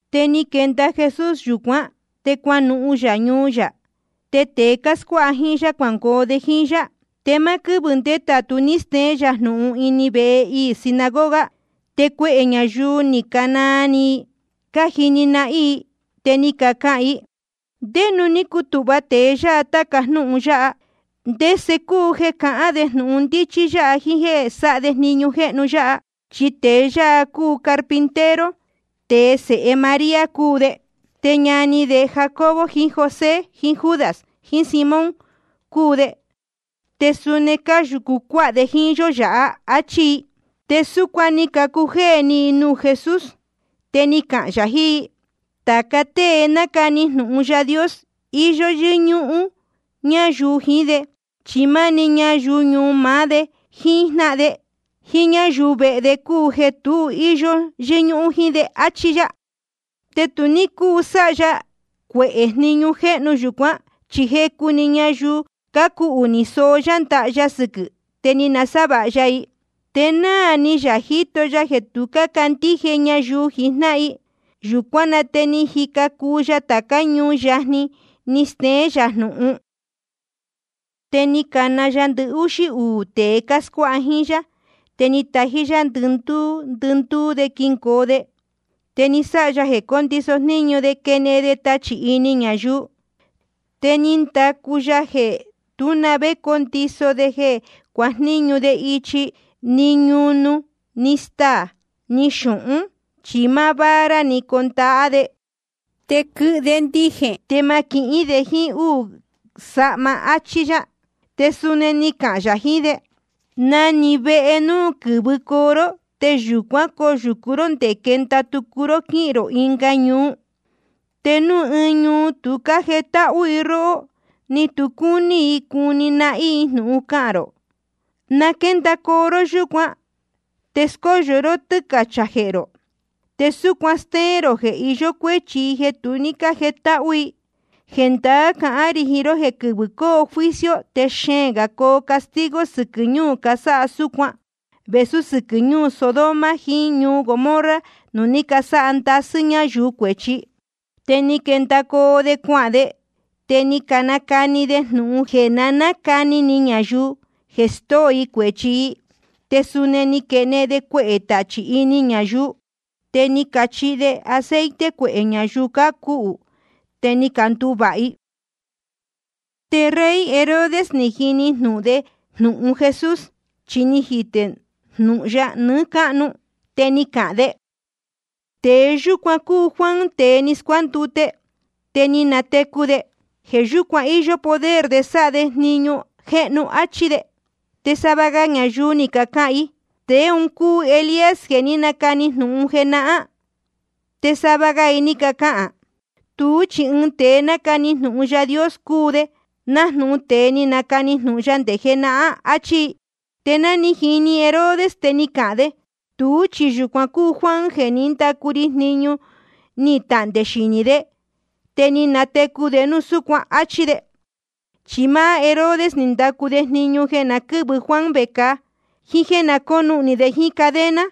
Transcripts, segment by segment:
Te ni quenda Jesús yūcuán, te cuanuhun yā ñuu yā. Te tēe cáscuáha jíín yá cuangoo de jíín yá. Te máá quɨ́vɨ̄ ndétātu ní steén yā jnūhun ini vehe iī sinagoga. Te cuehē ñayuu ni canaa ni i cájini nahín i, te ni cacahān i: ¿Ndé nuū ní cutūhva tēe yáha tāca jnúhun yáha? ¿Te ndese cúu jeē cahán de jnūhun ndíchí yáha jíín jéē sáha de jniñu jéhnu yáha? Chi tēe yáha cúu carpintero, te sēhe María cúu de, te ñani Jacobo jiín José jiín Judas jiín Simón cúu de. Te suni cáyūcu cuáha de jíín yó yāhá. Achí i. Te súcuan ni cacujéē ni i nuū Jesús. Te ni cahān yā jiín i: Tāca tée nácani jnūhun Yaā Dios, íyó yɨ́ñúhún ñayuu jiín de, chi máni ñayuu ñuu maá de, jíín jnáhan de, jíín ñáyuu vehe de cúu jeē tu íyó yɨ́ñúhún jíín de. Achí yá. Te tu ní cúu sáha ya cuehē jniñu jéhnu yūcuán. Chi jecu‑ni ñayuu cácuhū ni soó yá ndaha ya sɨquɨ̄ i, te ni nasávāha ya i. Te náā ni yā jíto ya jeē tu cácandíje ñayuu jijnáhan i. Yūcuán na te ni jica cuu ya tācá ñuu yajni, ni steén yā jnūhun. Te ni cana ya ndɨhúxí uū tēe cáscuáha jíín yá, te ni tají yá ndɨhuū ndɨhuū de quingoo de. Te ni sáha ya jeē cóndiso jníñu de quenehen de tachī ini ñayuu. Te ni ndacu ya jeē tú na vé condiso de jeē cuajníñu de ichi, ni ñunu, ni staā, ni xūhún. Chi máá vara‑ni condahá de. Te quɨhɨ de ndijēn, te ma quihín de jíín úū sahma, áchí yá. Te suni ni cahān yā jiín de: Na‑ni vehe núu ni quɨ̄vɨcoo ró, te yūcuán coyūcu ró ndé quenda tucu ró quíhīn rō ɨnga ñuu. Te núu ɨɨn ñuu tu cájetáhú i róhó, ni tu cúní i cuni nahín i jnūhun cahān rō, na quéndacoo ró yúcuan, te scóyo ró tɨ́cachā jehē rō, te súcuan stéén rō jeē iyó cuéchi i jeē tu ní cájetáhú i. Jendaá cahán rī jiín ró jeē quɨvɨ̄ coo juicio te xeēn gā coo castigo sɨquɨ̄ ñuu cásáha súcuan vēsú sɨquɨ̄ ñuu Sodoma jiín ñuu Gomorra nuū ní casáha ndasɨ́ ñáyuu cuēchi. Te ni quendacoo de cuahān de, te ni canacani de jnūhun jeē na nácani ni ñayuu jeē stóo i cuēchi i. Te suni ni caquenehen de cuehē tachī ini ñayuu. Te ni cachihi de aceite cuehē ñayuu cácuhū, te ni canduvāha i. Te rey Herodes ni jini jnūhun de jnūhun Jesús, chi ni jitē núu jnūhun ya nɨɨ́ cáhnu. Te ni cahān de: Tēe yúcuan cúu Juan tēe ni scuándute, te ni natecu de. Jeē yúcuan íyó poder de sáha de jniñu jéhnu. Achí de. Te sava ga ñayuu ni cacahān i: Tēe un cúu Elías jeē ní nacani jnūhun jenahán. Te sava ga i ni cacahān: Tuú chi ɨɨn tēe nácani jnūhun Yaā Dios cúu de, nájnūhun tēe ni canacani jnūhun ya nde jenahán, áchí i. Te ná ni jini Herodes, te ni cahān de: Tuú chi yūcuan cúu Juan jeē ní ndacu ri jniñu ni tahndē xinī, te ni natecu de núu súcuan, áchí de. Chi máá Herodes ni ndacu de jniñu jeē na quɨ́vɨ Juan vecāa, jíín jéē na cónuhnī de jíín cadena.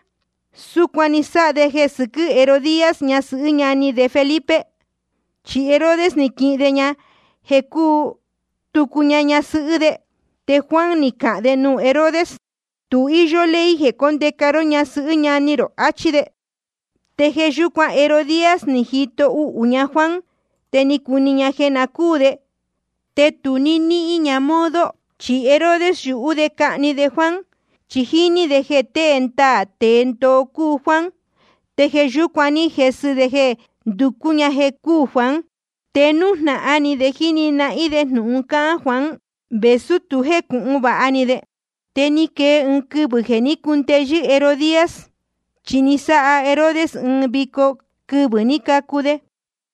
Súcuan ni sáha de jeē sɨquɨ́ Herodías, ñasɨhɨ́ ñani de Felipe. Chi Herodes ni quihin de ña jeē cúu tucu ña ñasɨhɨ́ de. Te Juan ni cahān de nuū Herodes: Tu íyó ley jeē cóndeca ró ñasɨhɨ́ ñani rō, achí de. Te jeē yúcuan Herodías ni jito uhū ña Juan, te cúní ña jeē na cúū de, te tu ní níhín ña modo. Chi Herodes yúhú de cahni de Juan, chi jíní de jeē tēe ndaā tēe ndoo cúu Juan. Te jeē yúcuan ní jesɨ de jeē nducú ña jeē cúū Juan. Te nújnahan ni de jíni nahín de jnūhun cáhán Juan, vēsú tu jécūhun vāha ni de. Te ni quee ɨɨn quɨvɨ̄ jeē ní cundeyɨ́ Herodías. Chi ni sáha Herodes ɨɨn vico quɨvɨ̄ ní cacu de,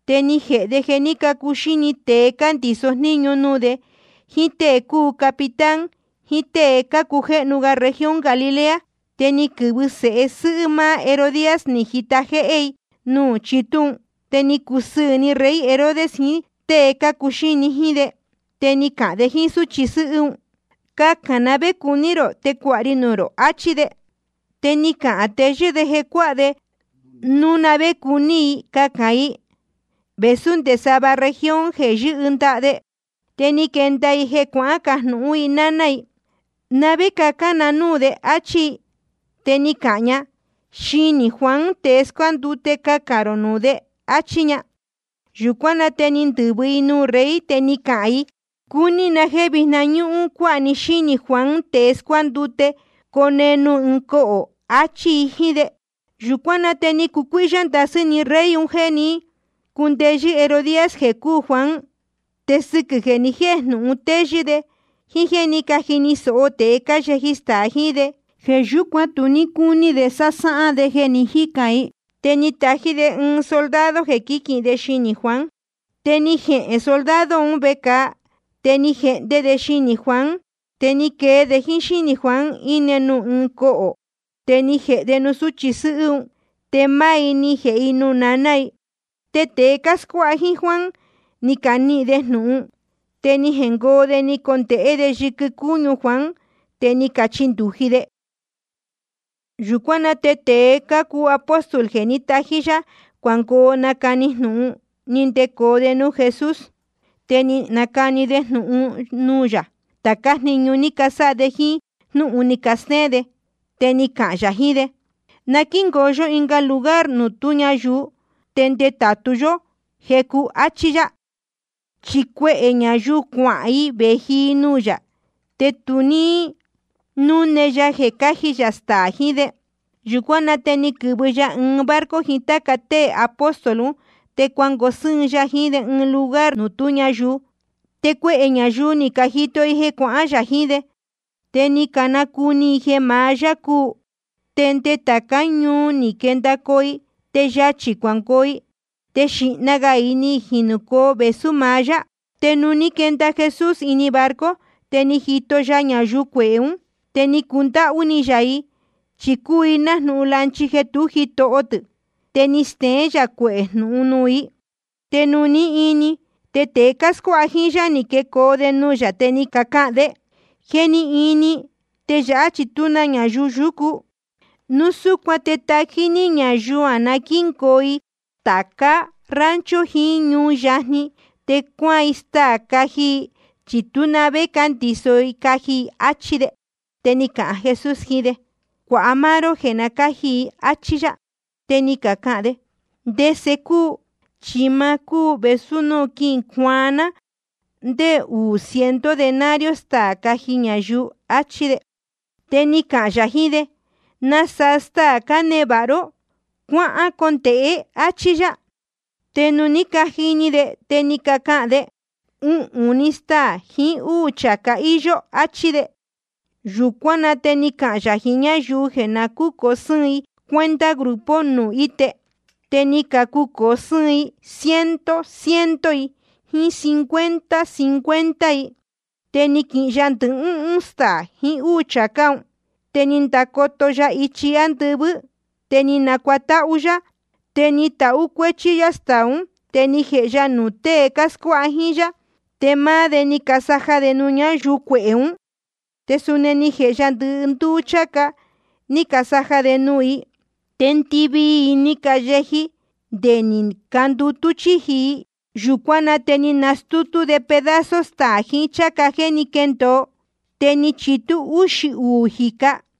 te ni jēhe de jeē ní cacuxíni tēe cándiso jníñu nuū de, jíín tée cácuu capitán, jíín tée cácujéhnu región Galilea. Te ni quɨ̄vɨ sēhe sɨ́hɨ́ máá Herodías, ni jita jéhé i nuū chitú un. Te ni cacusɨɨ̄ ni rey Herodes jiín tée cácuxíni jíín de. Te ni cahān de jíín súchi sɨ́hɨ́ un: Cacān na vé cuní rō, te cuāha ri nuū rō, achí de. Te ni cahān teyɨ́ de jeē cuáha de núu na vé cuní i cacān i, vēsú nde sava región jeē yɨ́hɨ ndaha de. Te ni quenda i, ni jecajnūhún i náná i: ¿Na vé cacān na núū de? áchí i. Te ni cahān ña: Xinī Juan tēe scuándute cacān rō nuū de, áchí ña. Yūcuán na te ni ndɨ̄vɨ‑ni i nuū rey, te ni cahān i: Cúní na jéē vijna ñúhún‑ni cuāha ní xínī Juan tēe scuándute, cone nuū ɨɨn cohō, achí i jíín de. Yūcuán na te ni cucuíhyá ndasɨ́ ni rey un jeē ní cundeyɨ́ Herodías jeē cúū Juan. Te sɨquɨ̄ jeē ni jéjnūhun téyɨ́ de, jíín jéē ní cajini sōho tēe cáyeji staā jiín de, jeē yúcuan tu ní cúní de sásáhán de jeē ni jícān i. Te ni tají‑ni de ɨɨn soldado jeē quíquīhin de xinī Juan. Te ni jehēn soldado un vecāa, te ni jehnde de xinī Juan. Te ni quee de jíín xínī Juan, íne nuū ɨɨn cohō. Te ni jēhe de nuū sūchi sɨ́hɨ́ un, te máá i ni jēhe i nuū naná i. Te tēe cáscuáha jíín Juan ni canihīn de jnūhun, te ni jengoo de, ni candonehen de yɨquɨ cúñu Juan, te ni cachindūji de. Yūcuán na te tēe cácuu apóstol jeē ní tají yá cuangoo nacani jnūhun, ni ndecoo de nuū Jesús. Te ni canacani de nuū yā tācá jniñu ni casáha de, jíín jnúhun ni castéén de. Te ni cahān yā jiín de: Na quíngoo yó ɨɨn lugar nuū tú ñayuu, te ndetātu yó jecu, achí yá. Chi cuehē ñayuu cuahān i vēji i nuū yā, te ni tu ní núne ya jeē cáji yā staā jiín de. Yūcuán na te ni quɨ̄vɨ ya ɨɨn barco jiín táca tée apóstol un, te cuangoo sɨ́ɨn ya jiín de ɨɨn lugar nuū tú ñayuu. Te cuehē ñayuu ni cajito i jeē cuahán yā jiín de, te ni canacuni i jeē maá yá cúu. Te nde tācá ñuu ni quendacoo i, te yachī cuangoo i, te xīhna gā i ni jinūcoo vēsú maá yá. Te nuū ní quenda Jesús ini barco, te ni jito ya ñayuu cuehē ún. Te ni cundáhú ni yā i, chi cúu i nájnūhun lanchi jeē tú jitoho tɨ̄. Te ni steén yā cuehē jnūhun nuū i. Te nuū ní ini, te tēe cáscuáha jíín yá, ni quecoo de nuū yā, te ni cacahān de: Je ni ini, te yāhá chi tú na ñayuu yúcu. Núu súcuan te tají ní ñayuu na quíngoo i tāca rancho jiín ñuu yajni, te cuaan i staā caji i, chi tú na vé cándiso i caji i, áchí de. Te ni cahān Jesús jiín de: Cuāha máá ró jeē cáji i, áchí yá. Te ni cacahān de: ¿Te ndese cuu? Chi ni ma cúu vēsú núu quicuaan ná ndé uū ciento denario staā caji ñayuu, achí de. Te ni cahān yā jiín de: ¿Nasaa staā cánevāha ró? Cuacondēhe, áchí yá. Te nuū ní cajini de, te ni cacahān de: Uhūn‑ni staā jiín úū chācá íyó, áchí de. Yūcuán na te ni cahān yā jiín ñáyuu jeē na cúcōo sɨ́ɨn i cuenta grupo nuū íte. Te ni cacucōo sɨ́ɨn ciento ciento i, jíín cincuenta cincuenta i. Te ni quihin ya ndɨhúhún staā jiín úū chācá un, te ni ndacoto ya ichi ándɨvɨ́, te ni nacuatáhú yá. Te ni tahú cuéchí yá staā ún, te ni jēhe ya nuū tée cáscuáha jíín yá, te máá de ni casaja de nuū ñáyuu cuehē ún. Te suni ni jēhe ya ndɨndúú chācá, ni casaja de nuū i. Te ndɨvii i ni cayeji, te ni candutú chíji i. Yūcuán na te ni canastútú de pedazo staā jiín cháca jéē ní quendōo, te ni chitú úxī uū jīca.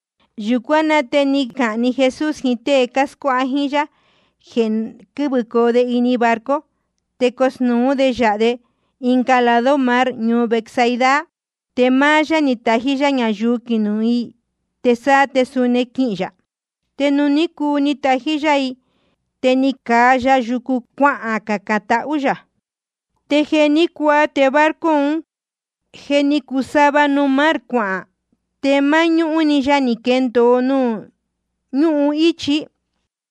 Yūcuán na te ni cahān‑ni Jesús jiín tée cáscuáha jíín yá jeē na quɨ́vɨcoo de barco, te cosnūú de yāha de ɨnga lado mar ñuu Betsaida. Te máá yá chi natají yá ñayuu quinuhun i, te sáá te suni quihīn yā. Te nuū ní cuu ni natají yá i, te ni caa ya yucu cuacacān tahú yā. Te jeē ní cuaa, te barco un je ni cuu sava nuū mar cuahān, te máñúhún‑ni ya ni quendōo nuū ñúhun íchi.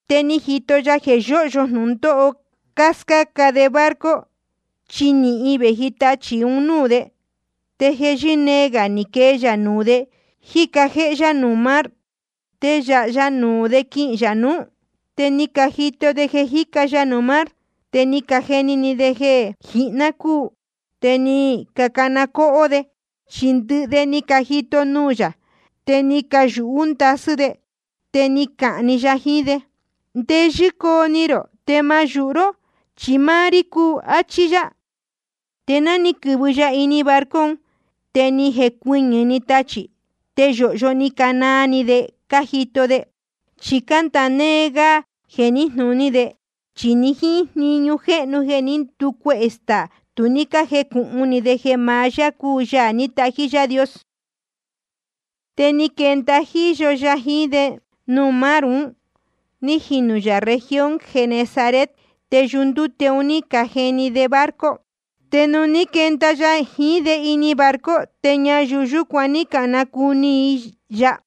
Te ni jito ya jeē yóhyo jnūndóho cáscáca de barco, chi nīhin vēji tachī ichi núú de. Te jeē yɨ́nee gā ni quee ya nuū de, jíca jéhé yá nuū mar. Te yāha ya nuū de quihīn yā nuú. Te ni cajito de jeē jíca ya nuū mar, te ni cajeni ni de jeē jihná cúu, te ni cacana cóhó de. Chi ndɨhɨ de ni cajito nuū yā, te ni cayūhú ndasɨ́ de. Te ni cahān‑ni ya jiín de: Ndeyɨ́ coo ni rō, te ma yūhu ró, chi máá rí cúu, áchí yá. Te ni quɨ̄vɨ ya ini barco un, te ni jecuɨñɨ̄‑ni tachī. Te yōhyo ni canaa ni de cájito de. Chi cándāa néé gá jeē níjnūní de, chi ni jíín jniñu jéhnu jeē ní nducuehē staā, tu ní cájecūhun ni de jeē maá yá cúu Yaā ní tají Yaā Dios. Te ni quenda jíyo ya jiín de nuū mar ún, ní jinū yā región Genesaret. Te yundúte un ní cajihni de barco. Te nuū ní quenda ya jiín de ini barco, te ñayuu yúcuan ni canacuni‑ni i ya.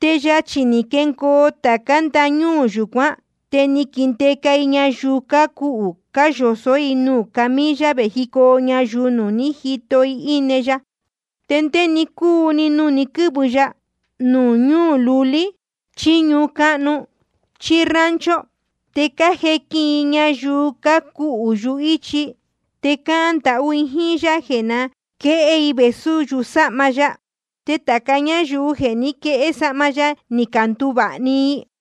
Te yachī ni jengoo i tācá ndañúū yūcuán, te ni caquindeca i ñayuu cácuhū, cáyosó i nuū camilla, vējicoo ñayuu nuū ní jito i íne ya. Te ndé‑ni cúu‑ni núu ni quɨ̄vɨ ya, núu ñuu lulí, chí ñuu cáhnu, chí rancho, te cájequin i ñayuu cácuhū yuhíchi, te cácahān ndahú i jíín yá jeē na quéhé i vēsú yusáhma ya. Te tāca ñáyuu jeē ní caquehé sahma ya, ni canduvāha‑ni i.